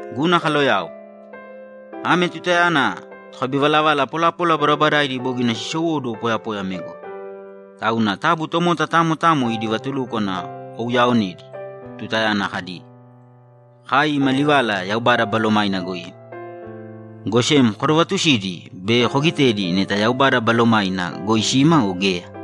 Guna kaloyao, ame tutayana tokabivalavala polapola badabadaidi bogina siisowóduwo poyapoya ame goi. Tauna taabu tomota tamo tamo idi vatulúkwana kouyaaonēdi tutayana kadi, ‘Kai ima livala Yaubada Balomaina goi ima.’ Go sem kodovaatusīdi be koogitēdi neta Yaubada Balomaina goi sima o geya.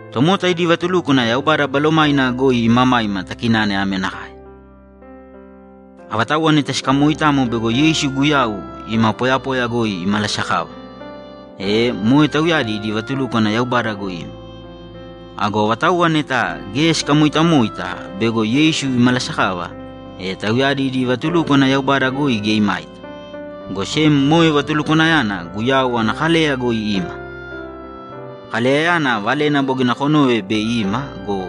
Tomota idi vatulúkwana Yaubada Balomaina goi imamaima takinane ame nakae: Avatauwa neta sikamooitamo bego Yeisu Guyau ima poyapoya goi imalasakava, e moe tauyadi idi vatulúkwana Yaubada goi ima. Ago avatauwa neta geya sikamoitamoita bego Yeisu imalasakava, e tauyadi idi vatulúkwana Yaubada goi geya imaita, go sem moe vatulukwanayana Guyau ana kaleya goi ima. Kaleyayana valena bogina konove bei ima go,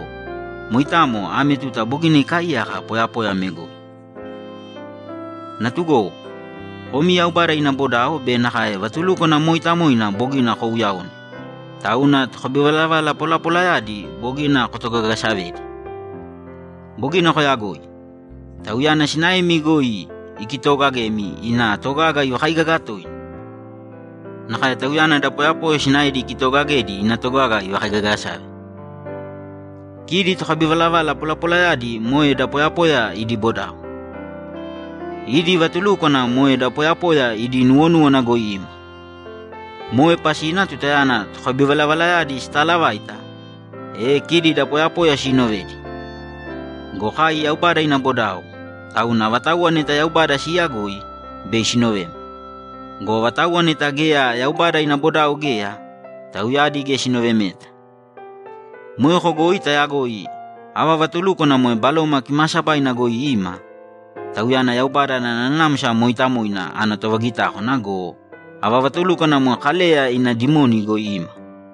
moitamo ame tuta bogina ikaaiyaka poyapoya ame goi. Natugowo, komi Yaubada ina bodao be nakae vatulúkwana mooitamoina bogina kouuyaone, tauna tokabivalavala polapolayadi bogina kotogagasavedi. Bogina koyagoi. Tauyana sinaemi goi ikitoogagemi ina togaga ivakaigaga toina; nakae tauyana da poyapoya sinaedi ikitoogagedi ina togaga ivakaigagasave. Kidi tokabivalavala polapolayadi moe da poyapoya idi bodao. Idi vatulúkwana moe da poyapoya idi nuwonúwana goi ima. Moe pasina tutayana tokabivalavalayadi sitaalavaita, e kidi da poyapoya siinovedi. Go kai Yaubada ina bodao, tauna avatauwa neta Yaubada siiyagoi, bei sinovema. Go avatauwa neta geya Yaubada ina bodao geya, tauyadi geya sinovemeta. Moeko goi tayagoi ava vatulúkwana moe Baloma Kimaasabaina goi ima, Tauyana Yaubada ana Nanamsa Mooitamoina ana tovagitákwana go, ava vatulúkwana moe Kaleya ina dimoni goi ima.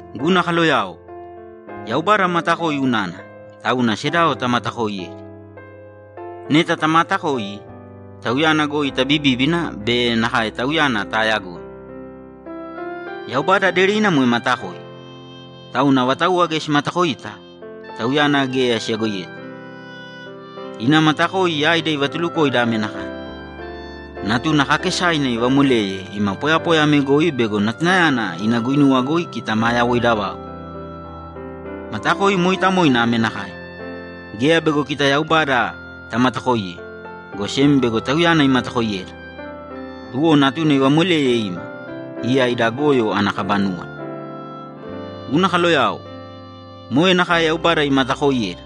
Guna kaloyao, Yaubada matakoi unana, tauna sedao tamatakooiyēdi. Neta tamaatakoi, Tauyana goi tabibíbina be nakae Tauyana taayagoi. Yaubada aderina moe matakoi. Tauna avatauwa geya simatakoita, Tauyana geya siyagoiyeta. Ina matakoi yaida ivatulukoida ame nakae: Natuna kaakesaina ivamoleye ima poyapoya ame goi bego Natunayana ina guinuwa goi kita maa yawoida vau. Matakoi mooitamoina ame nakae: Geya bego kita Yaubada tamatakoiye, go sem bego Tauyana imatakoiyeda, tuwo Natuna ivamoleye ima, iya ida goyo ana kaba núwala. Guna kaloyao, moe nakae Yaubada imatakooiyeda,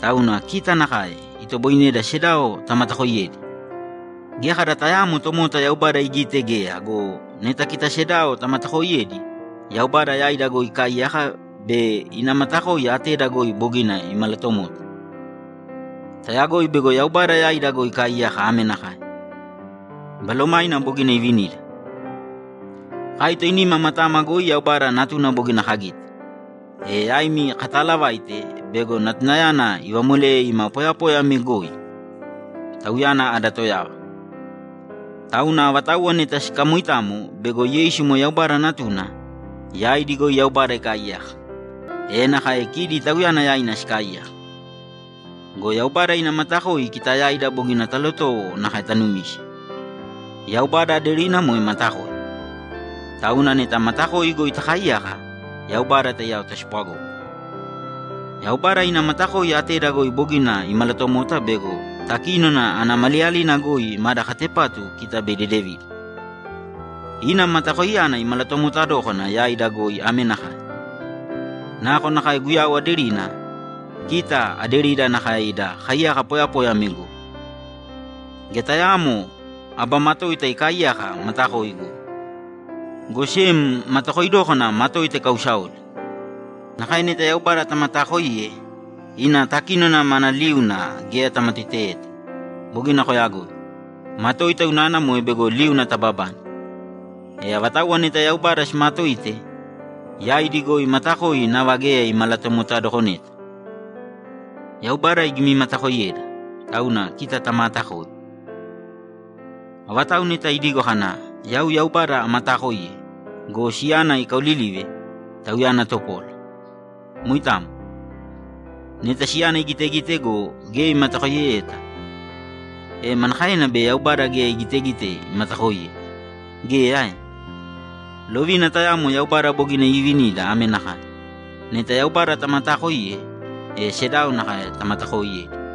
tauna kita nakae itoboineda sedao tamatakooiyedi. Geya kada tayaamo tomota Yaubada igite geya go, neta kita sedao tamatakooiyedi, Yaubada yaida goi ikaaiyaka be ina matakoi ateda goi bogina imalatomota. Tayagoi bego Yaubada yaida goi ikaaiyaka ame nakae: Balomaina bogina ivinida. Kai toinima matama goi Yaubada Natuna bogina kagite, e yaimi kataalavaite bego Natunayana ivamoleye ima poyapoya ame goi, Tauyana ada Toyava. Tauna avatauwa neta sikamoitamo bego Yeisu moe Yaubada Natuna, yaidi goi Yaubada ikaaiyaka, e nakae kidi Tauyana yaina sikaaiyaka. Go Yaubada ina matakoi kita yaida bogina talotowo nakae tanumise. Yaubada aderina moe matakoi, tauna neta matakoi goi takaaiyaka, Yaubada taiyao taspwagógana. Yaubada ina matakoi ateda goi bogina imalatomota bego takínona ana maliyalina goi mada katepatu kita bei dedevida. Ina matakoiyana imalatomota dókana yaida goi ame nakae: Nakonakae Guyau aderina, kita aderida nakae ida kaiyaka poyapoya ame goi. Geya tayaamo aba matoita ikaaiyaka matakoi goi. Go sem, matakoi dókana matoita ikausaoli. Nakae neta Yaubada tamataakoiye, ina takínona mana liuna geya tamatoiteyeta. Bogina koyagoi. Matoita unana moe bego liuna tababane. E avatauwa neta Yaubada simaatoite, yaidi goi matakoi nava geya imalatomotadokoneta. Yaubada igimimatakoiyeda, tauna kita tamaatakoi. Avatau neta idigo kana, ‘Yau Yaubada amataakoiye’ go, siyana ikaaolilive, tauyana topola. Moitamo. Neta siyana igitegite go, geya imatakoiyeyeta, e manakaena bei Yaubada geya igitegite imatakoiye? Geya ae? Lovina tayamo Yaubada bogina iivinida ame nakae: Neta Yaubada tamataakoiye, e sedao nakae tamatakooiyēdi.